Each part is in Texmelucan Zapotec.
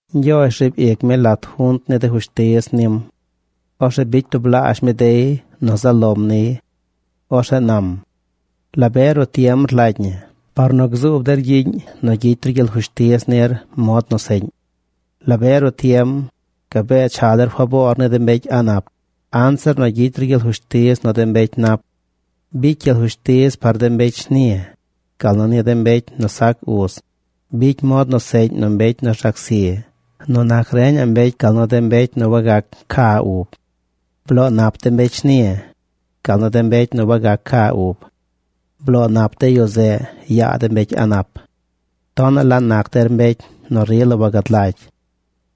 Ñgyoozh riib ic mi lat junt ni de fushtiz nim. Orzeꞌ bicy tublaazh mi dey nu zaꞌ lom niy. Orzeꞌ nam: “¿La be ruꞌ tiem rlagy ñi par nu gzuub der gyiꞌñ nu gyicy ru gyel fushtiz nir mod nu seꞌñ? ¿La be ruꞌ tiem, gabee cha der faboor ni de mbecy a̱ꞌ nap anzir nu gyicy ru gyel fushtiz nu de mbecy nap? Bicy gyel fushtiz par de mbecy shni, gal nu ni de mbecy sac uz. Bicy mod nu seꞌñ nu mbecy nu rzac zi nu nac reñaꞌ mbecy gal nu de mbecy nu wagac ca ub. Bloo nap de mbecy shni, gal nu de mbecy wagac ca ub. Bloo nap de yu zeꞌ yaa de mbecy a̱ꞌ nap. “Tonaꞌ la nac der mbecy nu rila wagad lagy.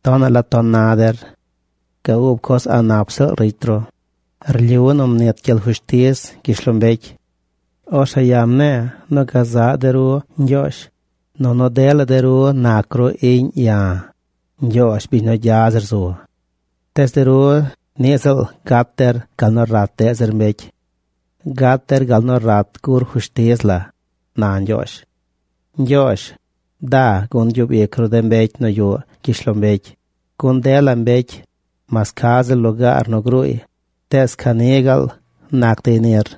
Tonaꞌ la ton na der. Ga ub coz a̱ꞌ nap ziꞌl ricy ru. Rlyu nu mnit gyel fushtiz gyishlombecy. Orzeꞌ ya̱ mne̱e̱ nu gazaꞌ de ru ñgyoozh, nunu dela de ru nac ru iꞌñ ya̱, Ñgyoozh, biñ nu gya zir zu. Tees de ru niꞌ ziꞌl gat der gal nu rat deꞌ zir mbecy. Gat der gal nu rat gur fushtiz la”, na Ñgyoozh. Ñgyoozh, da gun gyub ic ru de mbecy nu yuꞌ gyishlombecy, gun dela mbecy, mas ca ziꞌl lugaar nu gruuy, tees ca ni gaal nac dey nir.